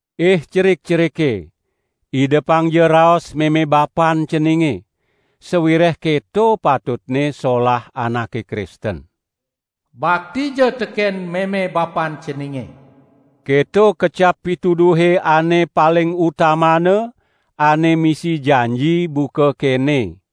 Ih cerik-cerike, idepangja raos meme bapan ceninge, sawireh keto patutne solah anake Kristen. "Baktija teken meme bapan ceninge", keto kecap pituduhe ane paling utamana, ane misi janji buka kene: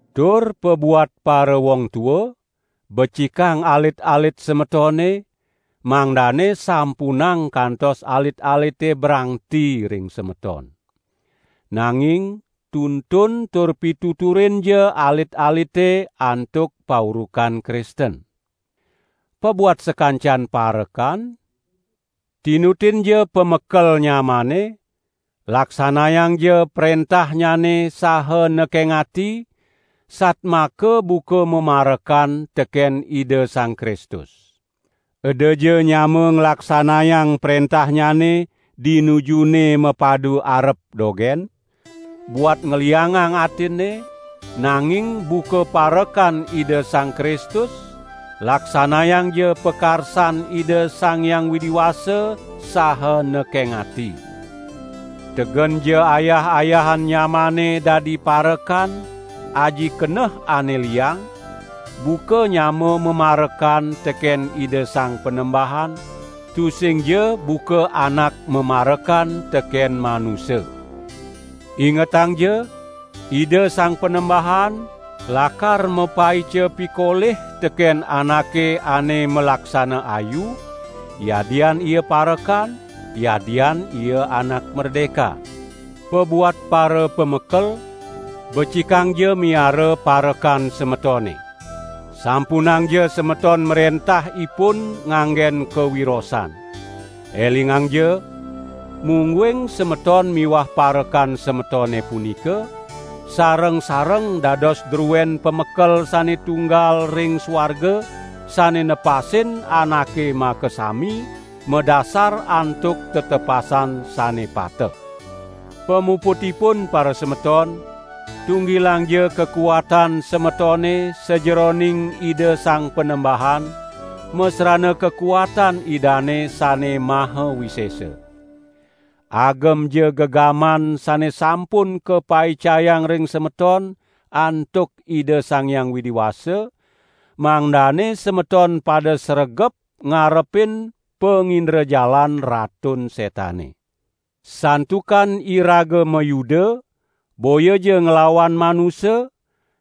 Tur pabuat parawong tua, becikang alit-alit semetone, mangdane sampunang kantos alit-alite brangti ring semeton. Nanging tuntun tur pituturinja alit-alite antuk paurukan Kristen. Pabuat sakancan parekan, tinutinja pamekel nyamane; laksanayangja prentahnyane saha nekeng ati, satmaka buka mamarekan teken Ida Sang Kristus. Edaja nyama nglaksanayang prentahnyane di nujune mapadu arep dogen, buat ngliangang atinne, nanging buka parekan Ida Sang Kristus, laksanayangja pakarsan Ida Sang Hyang Widi Wasa saha nekeng ati. Tegenja ayah-ayahan nyamane dadi parekan aji keneh ane liang, buka nyama mamarekan teken Ida Sang Panembahan, tusingja buka anak mamarekan teken manusa. Ingetangja, Ida Sang Panembahan lakar mapaica pikolih teken anake ane malaksana ayu, yadian ia parekan, yadian ia anak merdeka. Pabuat parapamekel, becikangja miara parekan semetone. Sampunangja semeton mrentah ipun nganggen kawirosan. Elingangja, mungguing semeton miwah parekan semetone punika, sareng-sareng dados druen Pamekel sane tunggal ring suarga, sane nepasin anake makasami madasar antuk tetepasan sane pateh. Pamuputipun parasemeton, tunggilangja kakuatan semetone sajeroning Ida Sang Panembahan, masrana kakuatan Idane sane maha wisesa. Agemja gegaman sane sampun kapaicayang ring semeton antuk Ida Sang Hyang Widi Wasa, mangdane semeton pada sregep ngarepin pangindrajalan Ratun Setane. Santukan iraga mayuda boyaja nglawan manusa,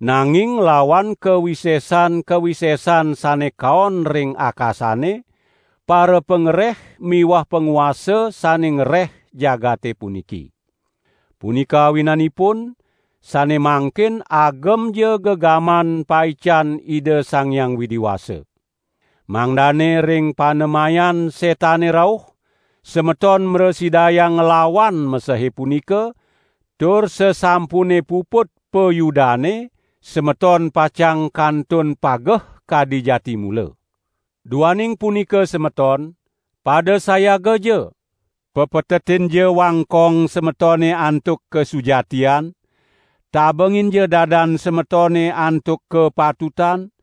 nanging nglawan kawisesan-kawisesan sane kaon ring akasane, parapangreh miwah panguasa sane ngreh jagate puniki. Punika awinanipun sane mangkin agemja gegaman paican Ida Sang Hyang Widi Wasa. Mangdane ring panemayan Setane rauh, semeton mrasidayang nglawan mesehe punika, tur sasampune puput payudane, semeton pacang kantun pageh kadi jati mula. Duaning punika semeton, pada sayagaja: pepetetinja wangkong semetone antuk kasujatian; tabenginja dadan semetone antuk kapatutan,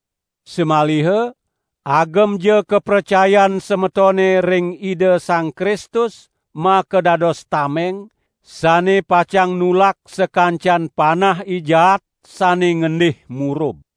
Samaliha agemja kapracayan semetone ring Ida Sang Kristus makadados tameng, sane pacang nulak sakancan panah I Jaat sane ngendih murub.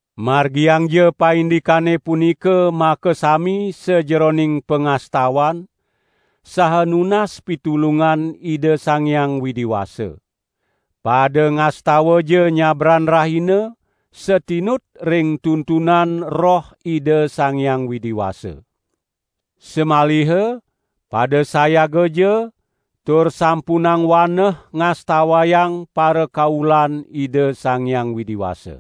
Margiangja paindikane punika makasami sajeroning pangastawan, saha nunas pitulungan Ida Sang Hyang Widi Wasa. Pada ngastawaja nyabran rahina satinut ring tuntunan Roh Ida Sang Hyang Widi Wasa. Samaliha pada sayagaja tur sampunang waneh ngastawayang parakaulan Ida Sang Hyang Widi Wasa.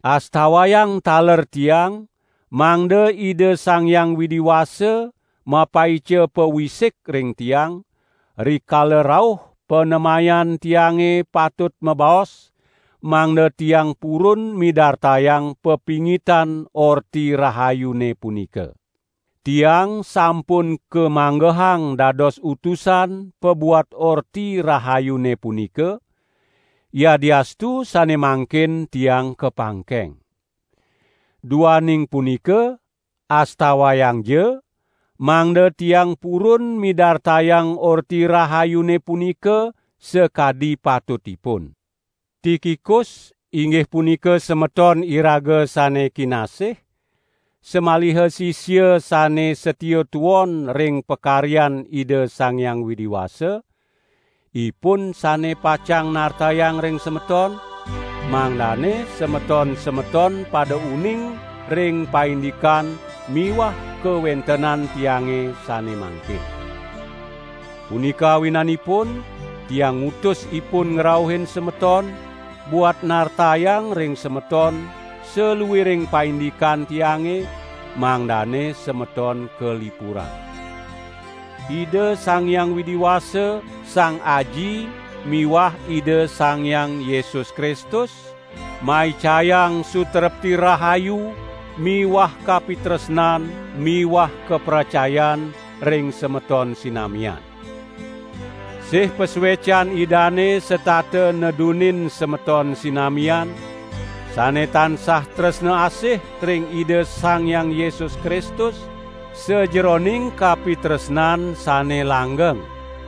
Astawayang taler tiang mangda Ida Sang Hyang Widi Wasa mapaica pawisik ring tiang, rikala rauh panemayan tiange patut mabaos, mangda tiang purun midartayang pepingitan Orti Rahayune punika. Tiang sampun kamanggehang dados utusan pabuat Orti Rahayune punika, yadiastu sane mangkin tiang kapangkeng. Duaning punika astawayangja, mangda tiang purun midartayang Orti Rahayune punika sakadi patutipun. Tikikus, inggih punika semeton iraga sane kinasih, samaliha sisia sane satia tuon ring pakaryan Ida Sang Hyang Widi Wasa, ipun sane pacang nartayang ring semeton, mangdane semeton-semeton pada uning ring paindikan miwah kawentenan tiange sane mangkin. Punika awinanipun, tiang ngutus ipun ngrauhin semeton, buat nartayang ring semeton saluiring paindikan tiange, mangdane semeton kalipurang. Ida Sang Hyang Widi Wasa, Sang Aji miwah Ida Sang Hyang Yesus Kristus maicayang sutrepti rahayu miwah kapitresnan miwah kapracayan ring semeton sinamian. Sih pasuecan Idane setata nedunin semeton sinamian, sane tansah tresna asih ring Ida Sang Hyang Yesus Kristus sajeroning kapitresnan sane langgeng.